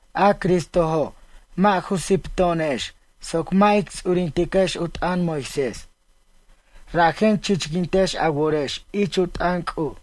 A Cristojo' mʌ' ju sipto'onex soc mʌ' ic ts'urintiquex u t'ʌn Moisés. Rajen chichquintex a worex ich u t'ʌn C'uj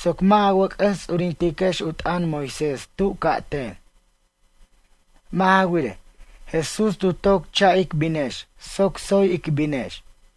soc mʌ' a wʌc'ʌs ts'urintex u t'ʌn Moisés tu ca'ten. Mʌ' ja wirej, Jesús tu toc cha' ic binex soc tsoy ic binex.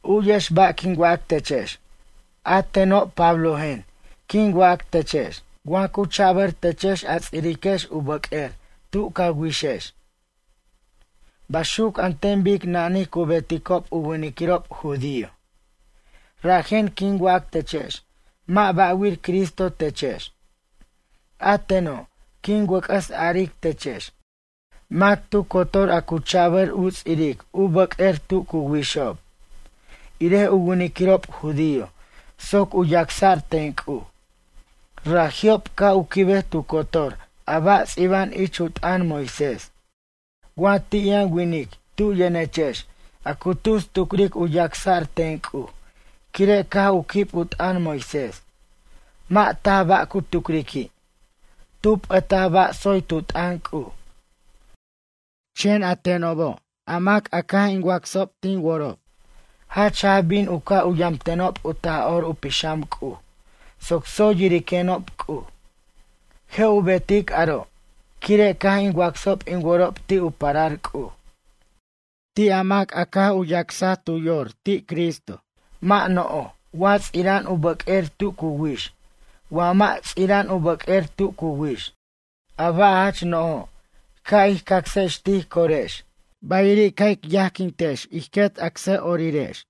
U'yex ba' quin wac techex, a teno' Pablojen quin wac techex. Wa cu chabʌr techex a ts'iriquex u bʌq'uer tu ca wixex, baxuc an ten bic nanij cu beticob u winiquirob judío, rajen quin wac techex mʌ' bʌ'wir Cristo techex. A teno' quin wʌc'ʌs aric techex. Mac tu cotor a cu chabʌr u ts'iric u bʌq'uer tu cu wixob, irej u winiquirob judío soc u yacsa'r ten C'uj. Raji'ob ca' u quibej tu cotor a ba' ts'iba'an ich u t'ʌn Moisés. Wa ti' yʌn winic tu yʌnechex a cu tus tucric u yacsa'r u ten C'uj quire' caj u quib u t'ʌn Moisés, mʌ' taj ba' cu tucriqui'. Tu p'ʌtaj ba' tsoy tu t'ʌn C'uj. Chen a tenobo' a mac a caj tin wacsob tin worob, jach jaj bin u ca' u yamtenob u Taj'or u Pixam C'uj soc tsoy yiriquenob C'uj. Je' u betic aro' quire' caj in wacsob in worob ti' u parar C'uj. Ti' a mac a caj u yacs tu yor ti' Cristo, mʌ' no'oj wa ts'ira'an u bʌq'uer tu cu wix wa mʌ' ts'ira'an u bʌq'uer tu cu wix. A ba' jach no'ojo' ca' ij cacsex tij corex bayiri' ca' ic yajquintex ij quet acsʌ'orirex.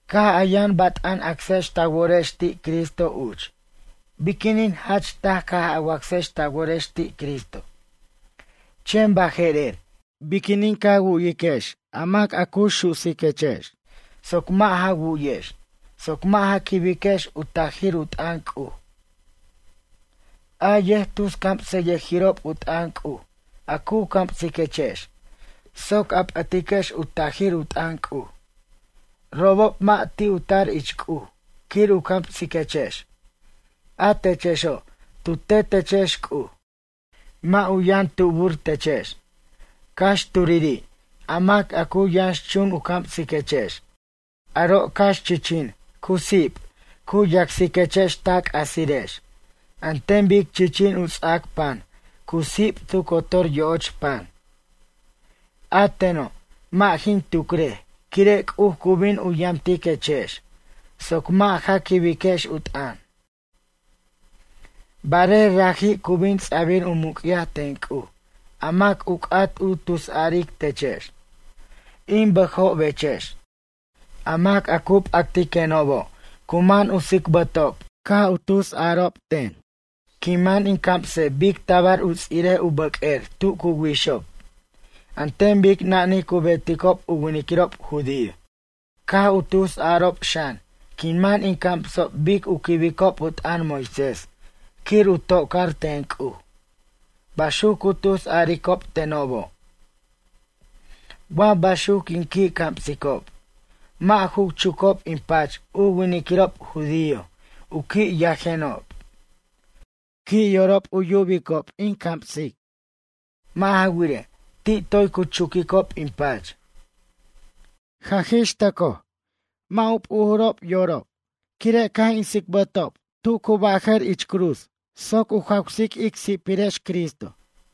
Caj a yʌn bat'an acsex ta worex ti' Cristo uch, biquinin jach taj caj a wacsex ta worex ti' Cristo. Chen baje'rer biquinin ca wu'yex a mac a cu susiquechex soc mʌ' ja wu'yex, soc mʌ' ja quibex u tajir u t'ʌn C'uj? A yʌjtuscamsʌyʌjirob u t'ʌn C'uj a cu camsiquechex soc a p'ʌtiquex u tajir u t'ʌn C'uj. Robob mʌ' ti' u tar ich C'uj quir u camsiquechex, a techexo' tu tet techex C'uj. Mʌ' u yʌn tubur techex. Cax turiri' a mac a cu yʌnxchun u camsiquechex. Aro' cax chichin cu sip cu yacsiquechex ta c'axirex, an ten bic chichin u ts'ac pan cu sip tu cotor yo'och pan. A teno' mʌ' jin tucrej quire' C'uj cu bin u yamtiquechex soc mʌ' ja quibex u t'ʌn. Barej raji' cu bin ts'abir u muc'yaj ten C'uj a mac u c'at u tusaric techex. In bʌjobechex. A mac a cu p'actiquenobo' cu man u tsicbʌtob caj tus a'arob ten quin man in camsej bic tabar u ts'irej u bʌq'uer tu cu wixob, an ten bic nani cu beticob u winiquirob judío. Caj u tus a'arob xan quin man in camsob bic u quibicob u t'ʌn Moisés quir u tocar ten C'uj. Baxuc cu tus a'aricob tenobo'. Wa baxuc quin qui' camsicob, mʌ' ju chucob in pach u winiquirob judío, u qui' yajenob. Qui' yorob u yubiquenob in camsic. Mʌ' ja wirej, ti' toy cu chuquicob in pach. Jaj ix tʌcoj, mʌ' u p'uj yorob quire' caj in tsicbʌticob tu cu baj ich cruz soc u jawsic ic si'pirex Cristo.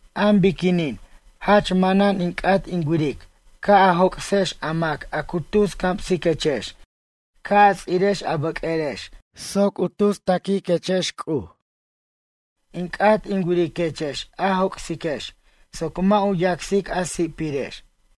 Am biquinin jach manan in c'at in wiric ca' a joc'sex a mac a cu tus camsiquechex ca' a ts'irex a bʌq'uerex soc u tus taquiquex C'uj. In c'at in wiriquex a joc'siquex soc mʌ' u yacsic a si'pirex.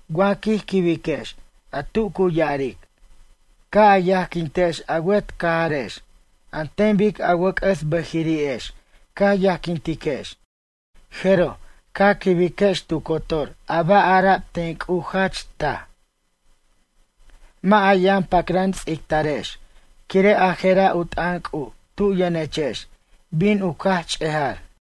Wa quij quibiquex a tu cu ya'aric: “Ca' a yajquintex a wet cajarex an ten bic a wʌc'ʌs bʌjiri'ex ca yajquintiquex”, jeroj, ca quibiquex tu cotor a ba' ara'b ten C'uj jach taj. Mʌ' a yʌn pacran ts'ictarex, quire' a je'ra' u t'ʌn C'uj tu yʌnechex bin u caj ch'ejar.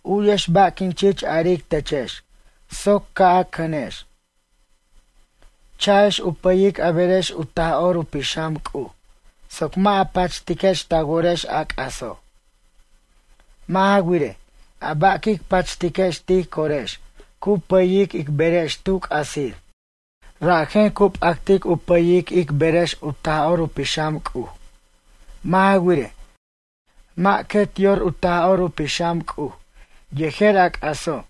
U'yex ba' quin chich aric techex soc ca' a cʌnex. Cha'ex u pʌyic a berex u Taj'or u Pixam C'uj soc mʌ' a pachtiquex ta worex a c'aso'. Mʌ' ja wirej, a ba' quic pachtiquex tij corex cu pʌyic ic berex tu c'asir. Rajen cu p'actic u pʌyic ic berex u Taj'or u Pixam C'uj. Mʌ' ja wirej, mʌ' quet yor u Taj'or u Pixam C'uj yejer a c'aso'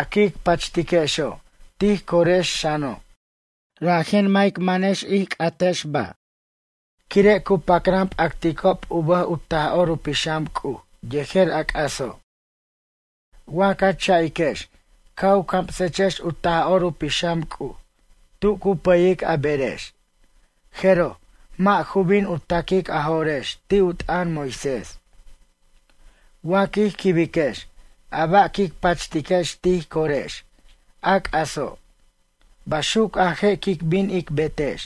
a quic pachtiquexo' tij corex xano'. Rajen mʌ' ic mʌnex ic ba' a c'atex quire' cu pacran p'aticob u bʌj u Taj'or u Pixam C'uj yejer a c'aso'. Wa ca cha'iquex ca' u camsechex u Taj'or u Pixam C'uj tu cu pʌyic a berex, jeroj, mʌ' ju bin u ta'quic a jo'rex ti' u t'ʌn Moisés. Wa quij quibiquex a ba' quic pachtquex tij corex, a c'aso', baxuc a je' quic bin ic betex: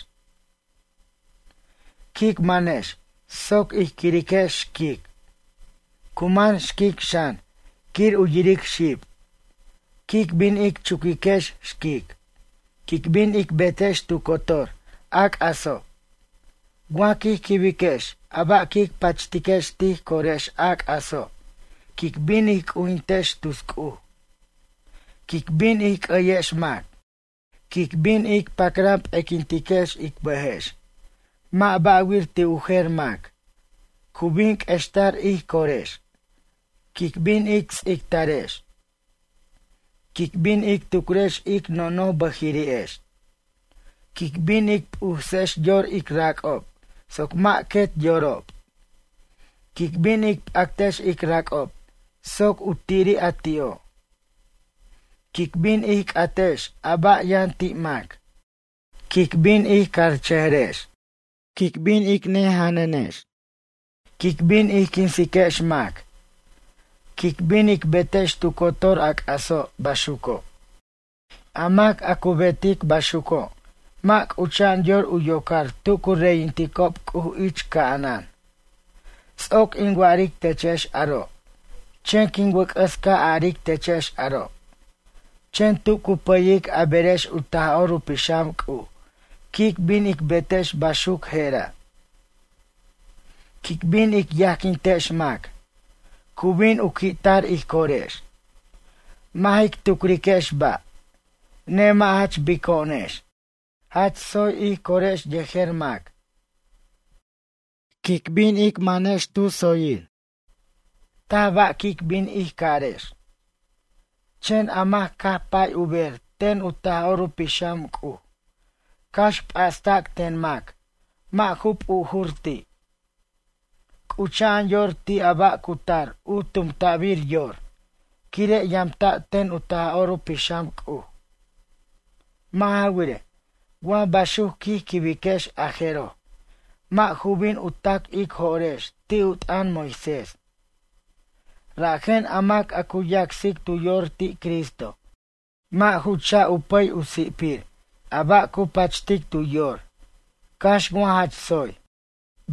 Quic manex soc ij quiriquex xquic. Cu man xquic xan quir u yiric xib. Quic bin ic chuquiquex xquic. Quic bin ic betex tu cotor a c'aso'. Wa quij quibiquex a ba' quic pachtiquex tij corex a c'aso', quic bin ij c'ujintex tus C'uj. Quic bin ij c'ʌyex mac. Quic bin ic pacran p'equintiquex ic bʌjex, mʌ' ba'wir ti' u jer mac. Cu bin q'uextar ij corex. Quic bin ic ts'ictarex. Quic bin ic tucrex ic nojnoj bʌjiri'ex. Quic bin ic p'usex yor ic rac'ob soc mʌ' quet yorob. Quic bin ic p'actex ic rac'ob soc u tiri' a ti'o'. Quic bin ij c'atex a ba' yʌn ti' mac. Quic bin ij carchʌjarex. Quic bin ic nejenjanrex. Quic bin ij quinsiquex mac. Quic bin ic betex tu cotor a c'aso' baxuco'. A mac a cu betic baxuco' mʌ' c'ucha'an yor u yocar tu cu reyinticob C'uj ich ca'anan. Ts'oc in wa'aric techex aro' chen quin wʌc'ʌs ca' aric techex aro'. Chen tu cu pʌyic a berex u Taj'or u Pixam C'uj quic bin ic betex baxuc jera': Quic bin ic yajquintex mac. Cu bin u qui'tar ij corex. Mʌ' jic tucriquex ba'. Nemʌ' jach bico'onex. Jach tsoy ij corex yejer mac. Quin bin ic manex tu tsoyir. Taj ba' quic bin ij carex. Chen a mac caj pay u ber ten u Taj'or u Pixam C'uj, cax p'asta'c ten mac mʌ' ju p'ujur ti'. C'ucha'an yor ti' a ba' cu tar u tumta'bir yor quire' yamta' ten u Taj'or u Pixam C'uj. Mʌ' ja wirej, wa baxuc quij quibiquex a jeroj, mʌ' ju bin u ta'c ic jo'rex ti' u t'ʌn Moisés. Rajen a mac a cu yacsic tu yor ti Cristo, mʌ' ju cha' u pʌy u si'pir a ba' cu pachtic tu yor cax wa jach tsoy.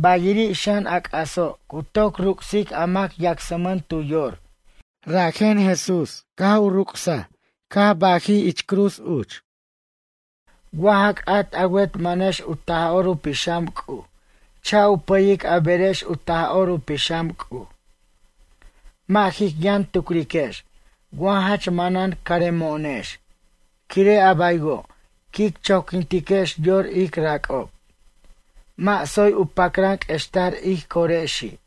Bayiri' xan a c'aso' cu toc ruc'sic a mac yacsmʌn tu yor, bajen Jesús caj u ruc'saj caj bajij ich cruz uch. Wa ja c'at a wet manex u Taj'or u Pixam C'uj cha' u pʌyic a berex u Taj'or u Pixam C'uj. Mʌ' jic yʌn tucriquex wa jach manan caremo'onex quire' a baywo' quic choquintiquex yor ic rac'ob. Mʌ' tsoy u pacran q'uextar ij corexi'.